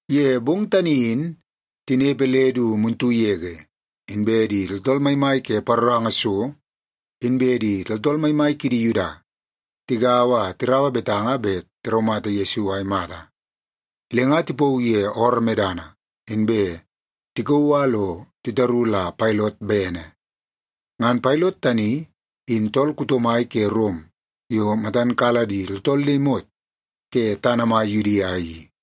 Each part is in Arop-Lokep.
Ye bong tani in tinepe le du muntu yege, inbe di tooltool maimai ke paroranga so inbe di tooltool maimai kidi Yuda tigaua a tiraua betanga bet tiraumata Yesu a imata. Le nga tipauu ye ooroo medana, inbe tikauu a lo titaru la Pailot bene. Ngan Pailot tani in tool kuto mai ke Rom yo matan kala di tooltool le imot ke tana mai Yudia i.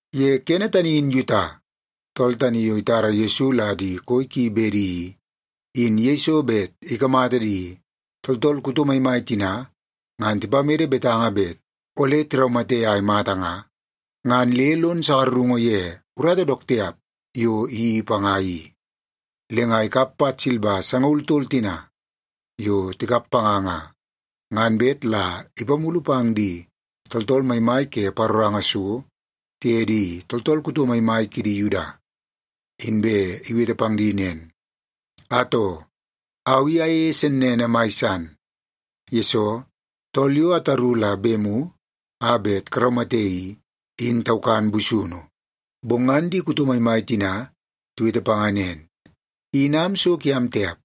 Ye kene tani in Yuta, tool tani yo itara Yesu la di koi ki bedi i, in yeiso bet ikamata di tooltool kuto maimai tina ngan tipamede betanga bet ole tiraumate a imata nga, ngan le lon sakarungu ye urata dook tiap yo iyeii panga i. Le nga ikap pat silba sangaul tol tina yo tikap panga nga, ngan bet la ipamulu pang di tooltool maimai ke paroranga so tiye di tooltool kuto maimai kidi Yuda. Inbe iwete pang di nen, “Atoo, au i ayeie sennene mai san, yesoo tool yo ataru la bemu a bet karaumate i, in taukan busunu.” Bong ngan di kuto maimai tina tiwete panga nen, “In am so kiam tiap.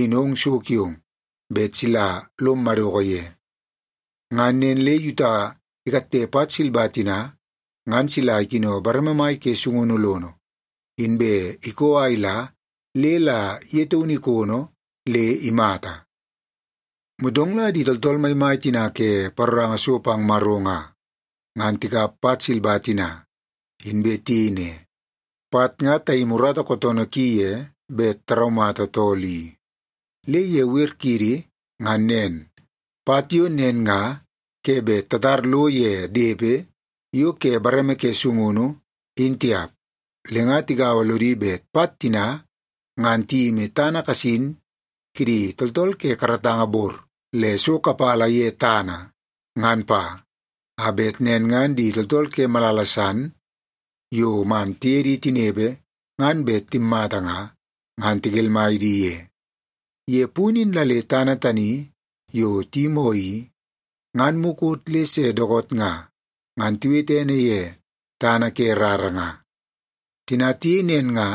In ong so kiong bet sila lom madoko ye.” Ngan nen le Yuta ikatte pat silba tina ngan sila ikino bareme mai ke sungunu lono, inbe ikoo a ila le la ye taunu ikono le imata. Motong la di tooltool maimai tina ke paroranga so pang Maro nga, ngan tikap pat silba tina, inbe tiyei ne, “Pat nga tayimi urata kootoonoo ki ye bet taraumata tool i. Le ye wer kiidi ngan nen, pat yo nen nga ke bet tatar lo ye depe yo ke bareme ke sungunu, in tiap.” Le nga tigaua lodi bet pat tina ngan tiyimi tana kasin kidi tooltool ke karatanga bor le so kapala ye tana, ngan pa. A bet nen ngan di tooltool ke malala san yo man tiye di tinepe ngan bet timmata nga, ngan tikelmai di ye. Ye punu in la le tana tani yo tiyimoo i, ngan mukot le se dookoot nga, ngan tiwete ene ye Tana Ke Rara nga. Tina tiyei nen nga,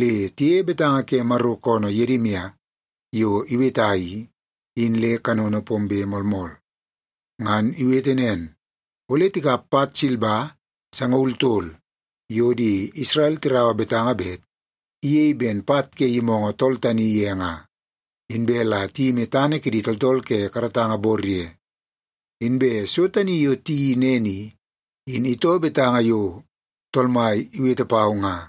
le tiyeie betanga ke Maro koonoo Yedimia yo iweta i, in le kanono pombe moolmool. Ngan iwete nen, “Ole tikap pat silba sangaul tol yo di Isrel tiraua betanga bet iyei ben pat ke yimoongoo tool tani ye nga, inbe la tiyimi tana kidi tooltool ke karatanga bor ye. Inbe so tani yo tiyeii nen i, in itoo betanga yo Tool Mai iwete pau nga.”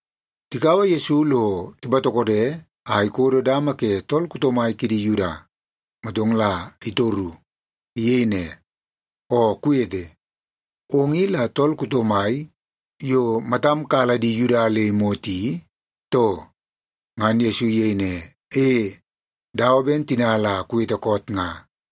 Tikaua Yesu lo tipatokode a ikodo dama ke tool kuto mai kidi Yuda, motong la itoru. Iyei ne, “Oo kuwete, ong i la tool kuto mai yo matam kala di Yuda le imot i, too?” Ngan Yesu iyei ne, “E, dawa ben tina la kuwete koot nga.”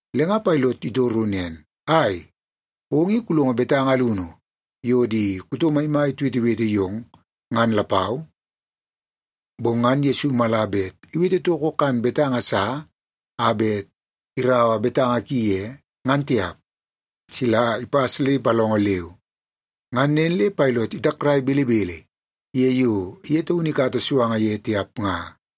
Le nga Pailot itoru nen, “Ai, ong i kulongo betanga alunu yo di kuto maimai tiwetewete yong, ngan lapau?” Bong ngan Yesu mala bet iwete toko kan betanga sa a bet iraua betanga ki ye, ngan tiap, sila ipas le ipalongo leu. Ngan nen le Pailot itakrai belebele ye yo ye taunu ikata suanga ye tiap nga.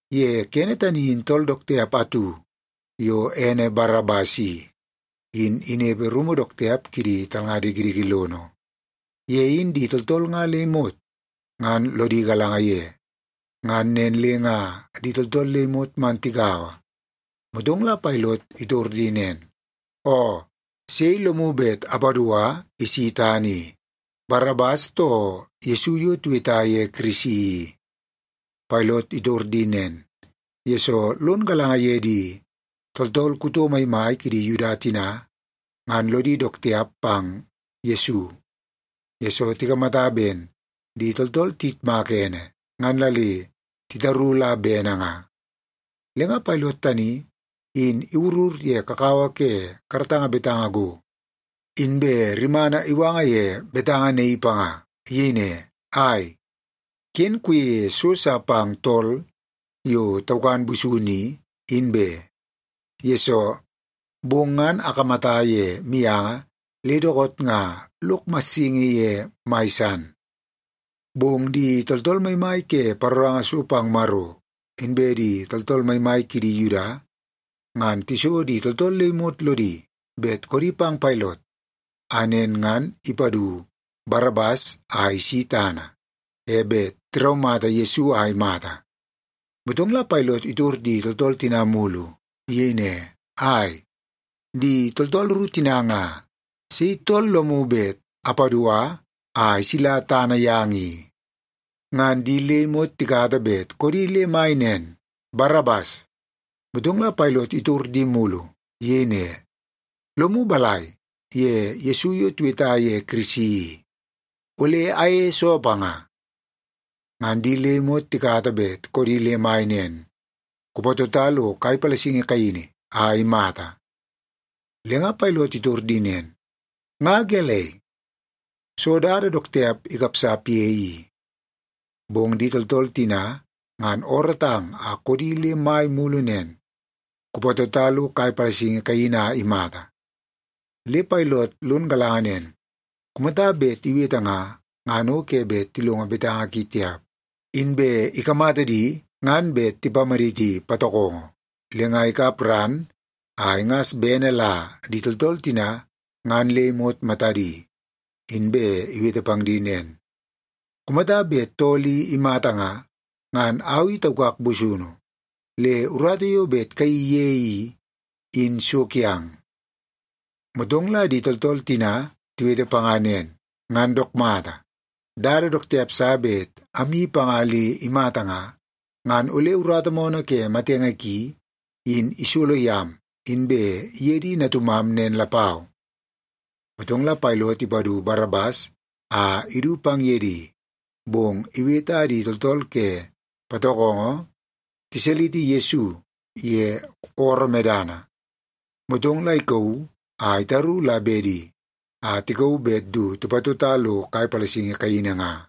Ye kene tani in tool dook tiap atu yo ene Barabas i, in inepe rumu dook tiap kidi talnga dikidiki lono. Ye in di tooltool nga le imot ngan lodi galanga ye. Ngan nen le nga di tooltool le imot man tigaua, motong la Pailot itor di nen, “Oo, sei lomu bet apadua isi tana i; Barabas, too Yesu yo tiweta ye Kirisi i?” Pailot itor di nen, yesoo lon galanga ye di tooltool kuto maimai kidi Yuda tina ngan lodi dook tiap pang Yesu, yesoo tikamata ben di tooltool tiyitmaka ene, ngan la le titaru la bene nga. Le nga Pailot tani in iwurur ye kakawa ke karatanga betanga go, inbe rimana iwanga ye betanga naii panga. Iyei ne, “Ai, ken kuyeie so sa pang tool yo taukan busunu i, in be. Yesoo, bong ngan akamata ye mianga le dookoot nga lok massingi ye mai san.” Bong di tooltool maimai ke paroranga so pang Maro, inbe di tooltool maimai kidi Yuda, ngan tiso di tooltool le imot lodi bet koodi pang Pailot a nen ngan ipadu Barabas a isi tana, e bet tiraumata Yesu a imata. Motong la Pailot itor di tooltool tina mulu. Iyei ne, “Ai, di tooltool ru tina nga, sei tool lomu bet apadua a isila tana yang i?” Ngan di le imot tikata bet koodi le mai nen, “Barabas!” Motong la Pailot itor di mulu. Iyei ne, “Lomu balai ye Yesu yo tiweta ye Kirisi i? Ole ayeie soo panga?” Ngan di le imot tikata bet koodi le mai nen, “Kupatota lo kai palasingi kaini a imata!” Le nga Pailot itor di nen, “Nga gelei? Soo dada dook tiap ikapsap ye i?” Bong di tooltool tina ngan oorootang a koodi le mai mulu nen, “Kupatota lo kai palasingi kaini a imata!” Le Pailot lon galanga nen, kumata bet iwete nga, ngan o ke bet tilongo betanga ki tiap. Inbe ikamata di ngan bet tipamaditi patokongo. Le nga ikap ran a ingas bene la di tooltool tina ngan le imot matadi, inbe iwete pang di nen, “Kumata bet tool i imata nga, ngan au i taukak busunu. Le urata yo bet kayeii ye i, in so kiang.” Motong la di tooltool tina tiwete panga nen, “Ngan dook mata, dada dook tiap sa bet amyeii panga le imata nga, ngan ole urata moonoo ke matenge ki in isolo yam inbe ye di natumam nen lapau.” Motong la Pailot ipadu Barabas a idu pang ye di. Bong iwete a di tooltool ke patokongo tisaliti Yesu ye ooroo medana, motong la ikauu a itaru la bedi a tikauu bet du tipatota lo kai palasingi kaini nga.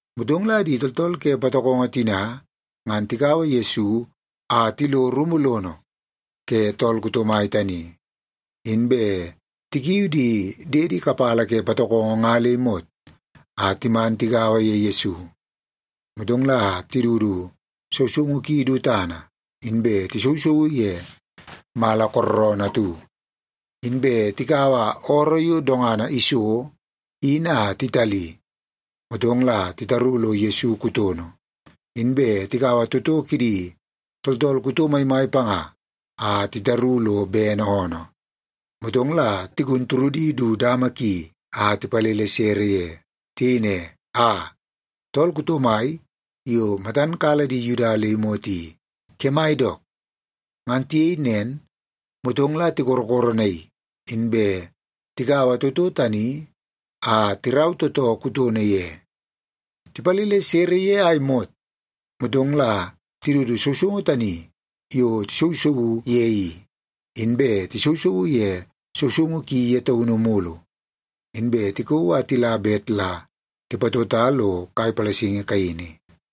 Motong la di tooltool ke patokongo tina ngan tikaua Yesu a tilo rumu lono ke tool kuto mai tani, inbe tikiu di diedi kapala ke patokongo nga le imot a timan tigaua ye Yesu. Motong la tidudu sousoungu ki du tana, inbe tisousouu ye mala kooroonoo atu. Inbe tikaua ooroo yo dongana iso in a titali, motong la titaru lo Yesu kutono. Inbe tikaua toto kidi tooltool kuto maimai panga a titaru lo bene oonoo, motong la tigun turudi du dama ki a tipalele sere ye. Tiyei ne, “Aa, tool kuto mai yo matam kala di Yuda le imot i, kemai dook!” Ngan tiyei nen, motong la tikorokoronaii, inbe tikaua toto tani a tirau tootoo kutono ye. Tipalele sere ye a imot, motong la tidudu sousoungu tani yo tisousouu ye i, inbe tisousouu ye sousoungu ki ye taunu mulu, inbe tikauu a tila bet la tipatota lo kai palasingi kaini.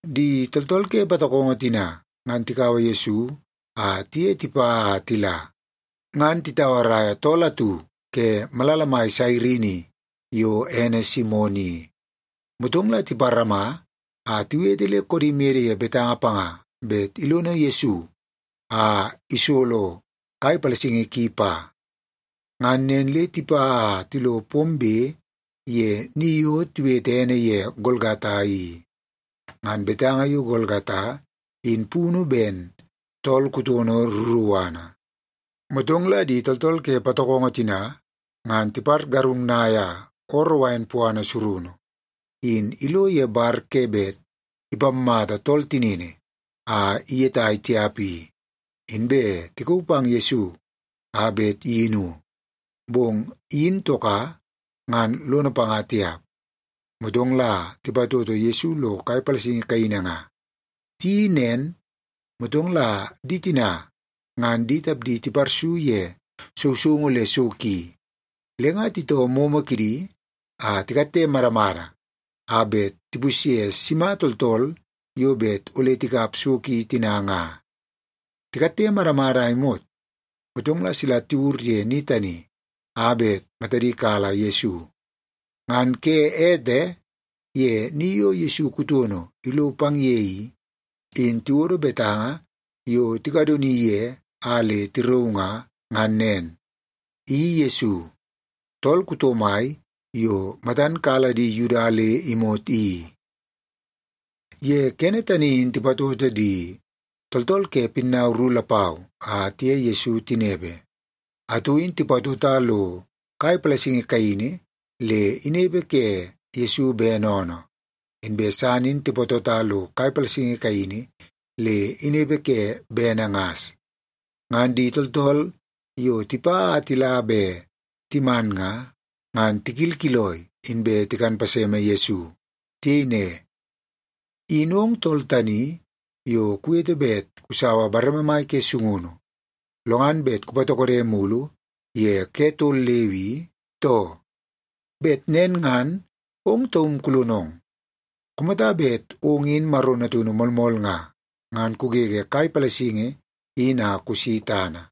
Di tooltool ke patokongo tina ngan tikaua Yesu a tiye tipa a tila, ngan titauaraia tool atu ke malala mai Sairini yo ene Simon i. Motong la tiparama a tiwete le koodi mede ye betanga panga bet ilono Yesu a isolo kai palasingi ki pa. Ngan nen le tipa a tilo pombe ye ni yo tiwete ene ye Golgata i. (Ngan betanga yo Golgata in punu ben Tool Kutono Ruruana). Motong la di tooltool ke patokongo tina ngan tipargarungnaia ooroo wain puana surunu in ilo ye bar ke bet ipammata tool tinini a iyetai tiap i, inbe tikauu pang Yesu a bet iyinu. Bong iyin toka, ngan lono panga tiap. Motong la tipatoto Yesu lo kai palasingi kaini nga. Tiyeii nen, motong la di tina ngan di tapdi tiparsu ye sousoungu le so ki, le nga titoo moomoo kidi a tikatte madamada a bet tipusye sima tooltool yo bet ole tikap so ki tina nga. Tikatte madamada a imot, motong la sila tiwur ye ni tani a bet matadi kala Yesu. Ngan ke ete, ye ni yo Yesu kutono ilo pang ye i, in tiwodo betanga yo tikadoni ye a le tirauu nga, ngan nen: I Yesu, Tool Kuto Mai Yo Matan Kala Di Yuda Le Imot I. Ye kene tani in tipatoto di tooltool ke pinnau ru lapau a tiye Yesu tinepe. Atu in tipatota lo kai palasingi kaini le inepe ke Yesu bene oonoo, inbe san in tipatota lo kai palasingi kaini le inepe ke bene ngas. Ngan di tooltool yo tipa a tila be timan nga, ngan tikilkiloi, inbe tikan paseme Yesu. Tiyei ne, “In ong tool tani yo kuwete bet kusaua bareme mai ke sungunu, lo ngan bet kupatokode mulu ye ke tol leu i, too? Bet nen ngan ong taum kulonong! Kumata bet ong in Maro Natunu moolmool nga, ngan kugege kai palasingi in a kusi tana!”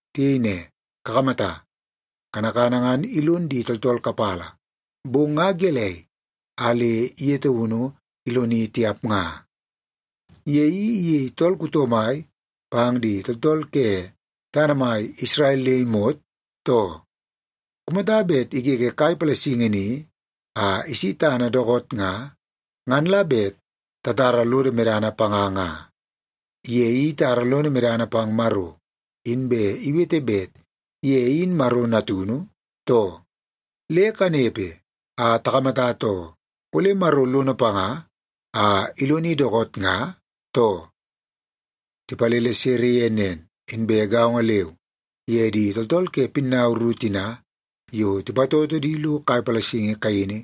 Tiyei ne, “Kakamata, kanakana ngan ilon di tooltool kapala, bong nga gelei a le ye taunu iloni tiap nga? Ye i iyei tool kuto mai pang di tooltool ke tana mai Isrel le imot, too? Kumata bet igege kai palasingi ni a isi tana dookoot nga, ngan la bet tatara lodo medana panga nga. Ye i itara lono medana pang Maro, inbe iwete bet ye in Maro Natunu, too? Le kanepe a takamata too, ole Maro lono panga a iloni dookoot nga, too?” Tipalele sere ye nen, inbe gaongo leu ye di tooltool ke pinnau ru tina yo tipatoto di lo kai palasingi kaini,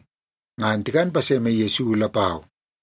ngan tikan paseme Yesu lapau.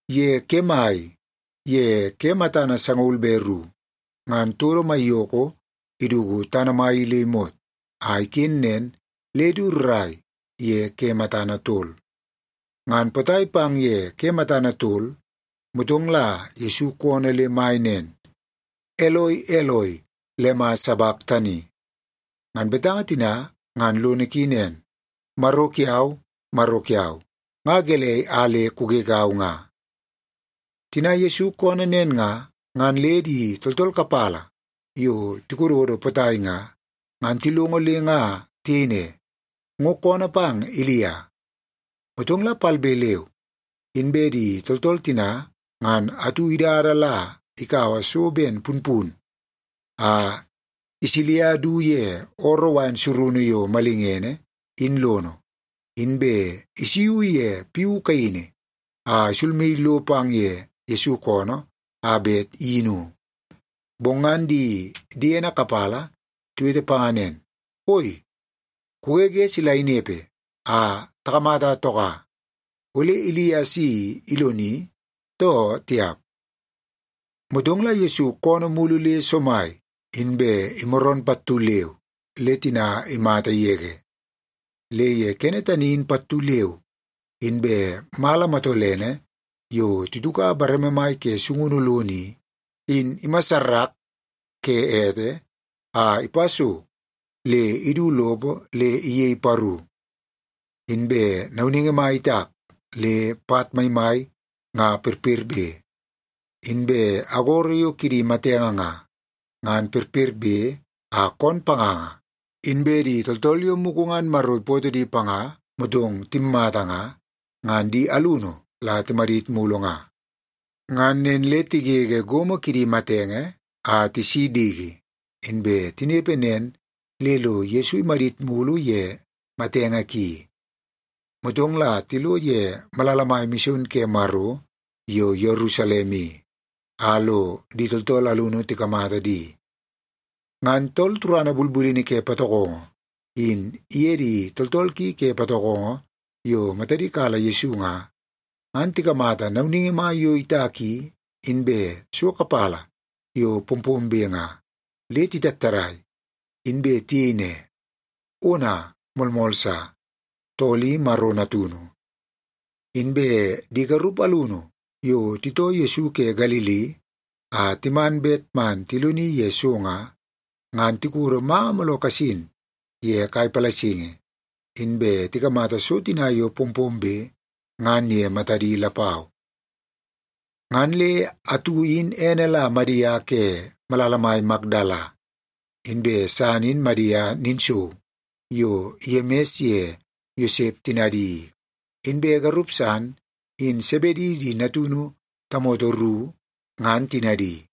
Ye kemai ye ke matana sangaul be ru, ngan todo maiyoko iduku tana mai i le imot, a iken nen le du rrai ye ke matana tol. Ngan potai pang ye ke matana tol, motong la Yesu koonoo le mai nen, “Eloi, Eloi, lema sabaktani?” Ngan betanga tina ngan lono ki nen, “Maro kiau, Maro kiau, nga gelei a le kugegau nga?” Tina Yesu koonoo nen nga, ngan le di tooltool kapala yo tikododo potai nga, ngan tilongo le nga tiyei ne, “Ngo koonoo pang Ilia.” Motong la palbe leu inbe di tooltool tina ngan atu idada la kaua so ben punpun a isilia du ye ooroo wain surunu yo malingene in lono, inbe isuiu ye piu kaini a isulmaii lo pang ye Yesu koonoo a bet iyinu. Bong ngan di diene kapala tiwete panga nen, “Oi, kugege sila inepe a takamata toka. Ole Ilia si iloni, too tiap?” Motong la Yesu koonoo mulu le somai, inbe imaroon pattu leu le tina imata yege. Le ye kene tani in pattu leu inbe mala matolene yo tituka bareme mai ke sungunu lono i, in imassarak ke ete a ipa so le idu lopo le iyei paru. Inbe nauningi mai itak le pat maimai nga perperbe. Inbe agoro yo kidi matenge nga, ngan perperbe a koon panganga, inbe di tooltool yo mugu ngan Maro ipootoo di panga motong timmata nga, ngan di alunu la timadit mulu nga. Ngan nen le tigege gomo kidi matenge a tisi diki, inbe tinepe nen le lo Yesu imadit mulu ye matenge ki. Motong la tilo ye malala mai mison ke Maro yo Yerusalem i, a lo di tooltool alunu tikamata di. Ngan tool turana bulbulini ke patokongo, in iye di tooltool ki ke patokongo yo matadi kala Yesu nga, ngan tikamata nauningi mai yo itak i, inbe so kapala yo pompombe nga, le titattadai, inbe tiyei ne, “Ona, moolmool sa, tool i Maro Natunu!” Inbe di garup alunu yo titoo Yesu ke Galili a timan bet man tiloni ye so nga, ngan tikodo manga mooloo kasin ye kai palasingi, inbe tikamata so tina yo pompombe ngan ye matadi lapau. Ngan le atu in ene la Madia ke malala mai Makdala, inbe san in Madia ninsou yo Yemis ye Yosep tinadi i, inbe garup san in Sebedi di natunu tamoto ru ngan tinadi.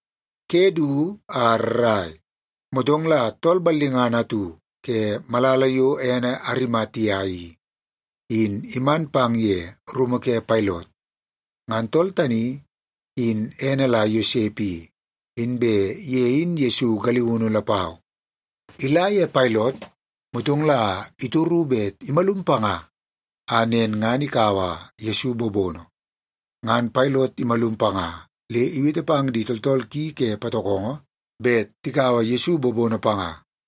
Ke du a rrai, motong la tool ballingana atu ke malala yo ene Arimatia i, in iman pang ye rumu ke Pailot. Ngan tool tani in ene la Yosep i, inbe ye in Yesu galiunu lapau. Ila ye Pailot, motong la itoru bet imalum panga a nen ngan ikaua Yesu bobono. Ngan Pailot imalum panga le iwete pang di tooltool ki ke patokongo bet tikaua Yesu bobono panga.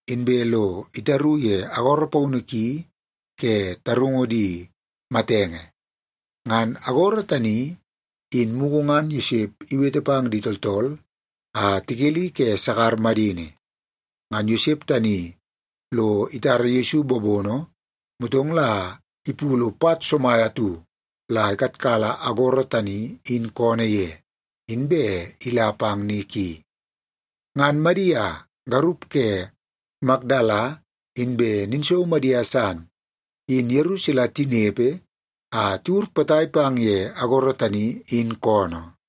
inbe lo itaru ye agoro paunu ki ke tarungu di matenge. Ngan agoro tani, in mugu ngan Yosep iwete pang di tooltool a tikeli ke sakar madini. Ngan Yosep tani lo itara Yesu bobono, motong la ipulu pat somai atu la ikatkala agoro tani in koonoo ye, inbe ila pang ni ki. Ngan Madia, garup ke Makdala, inbe ninsou Madia san, in yeru sila tinepe a tiwur potai pang ye agoro tani in koonoo.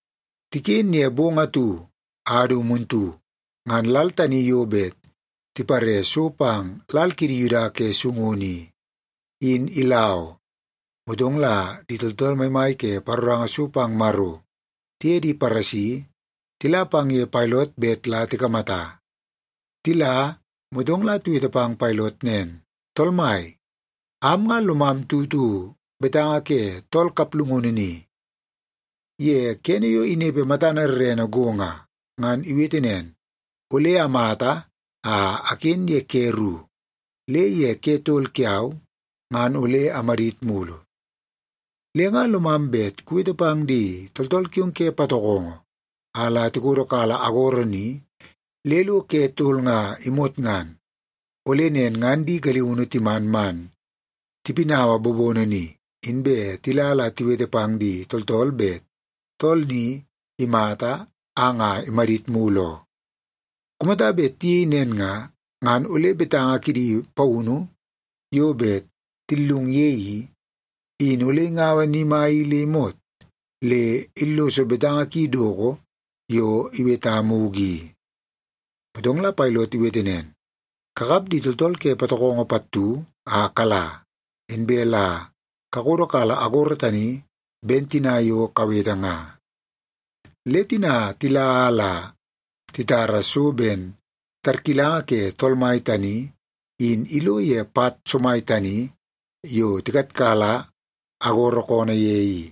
Tiken ye bong atu a du muntu, ngan lal tani yo bet tipare so pang lal kidi Yuda ke sungunu i, in ila oo. Motong la di tooltool maimai ke paroranga so pang Maro tiye di Paresi tila pang ye Pailot bet la tikamata. Tila, motong la tiwete pang Pailot nen, “Tool mai, am nga lomam tutu betanga ke tool kaplungunu ni. Ye kene yo inepe matana rerene go nga, ngan iwete nen, ‘Ole amata a aken ye ke ru, le ye ke tol kiau ngan ole amadit mulu.’ Le nga lomam bet kuwete pang di tooltool kiong ke patokongo a la tikodokala agoro ni le lo ke tol nga imot ngan. Ole nen ngan di galiunu timan man tipinaua bobono ni, inbe tila la tiwete pang di tooltool bet tool ni imata a nga imadit mulu oo. Kumata bet tiyei nen nga, ngan ole betanga kidi paunu yo bet tillung ye i, in ole ingaua ni mai i le imot, le illoso betanga ki doko yo iweta mugu i.” Motong la Pailot iwete nen, “Kakap di tooltool ke patokongo pattu a kala, inbe la kakodokala agoro tani ben tina yo kawete nga.” Le tina tila a la titara so ben tarkilanga ke tool mai tani in ilo ye pat somai tani yo tikatkala agoro koonoo ye i.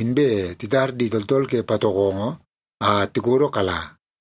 Inbe titar di tooltool ke patokongo a tikodokala.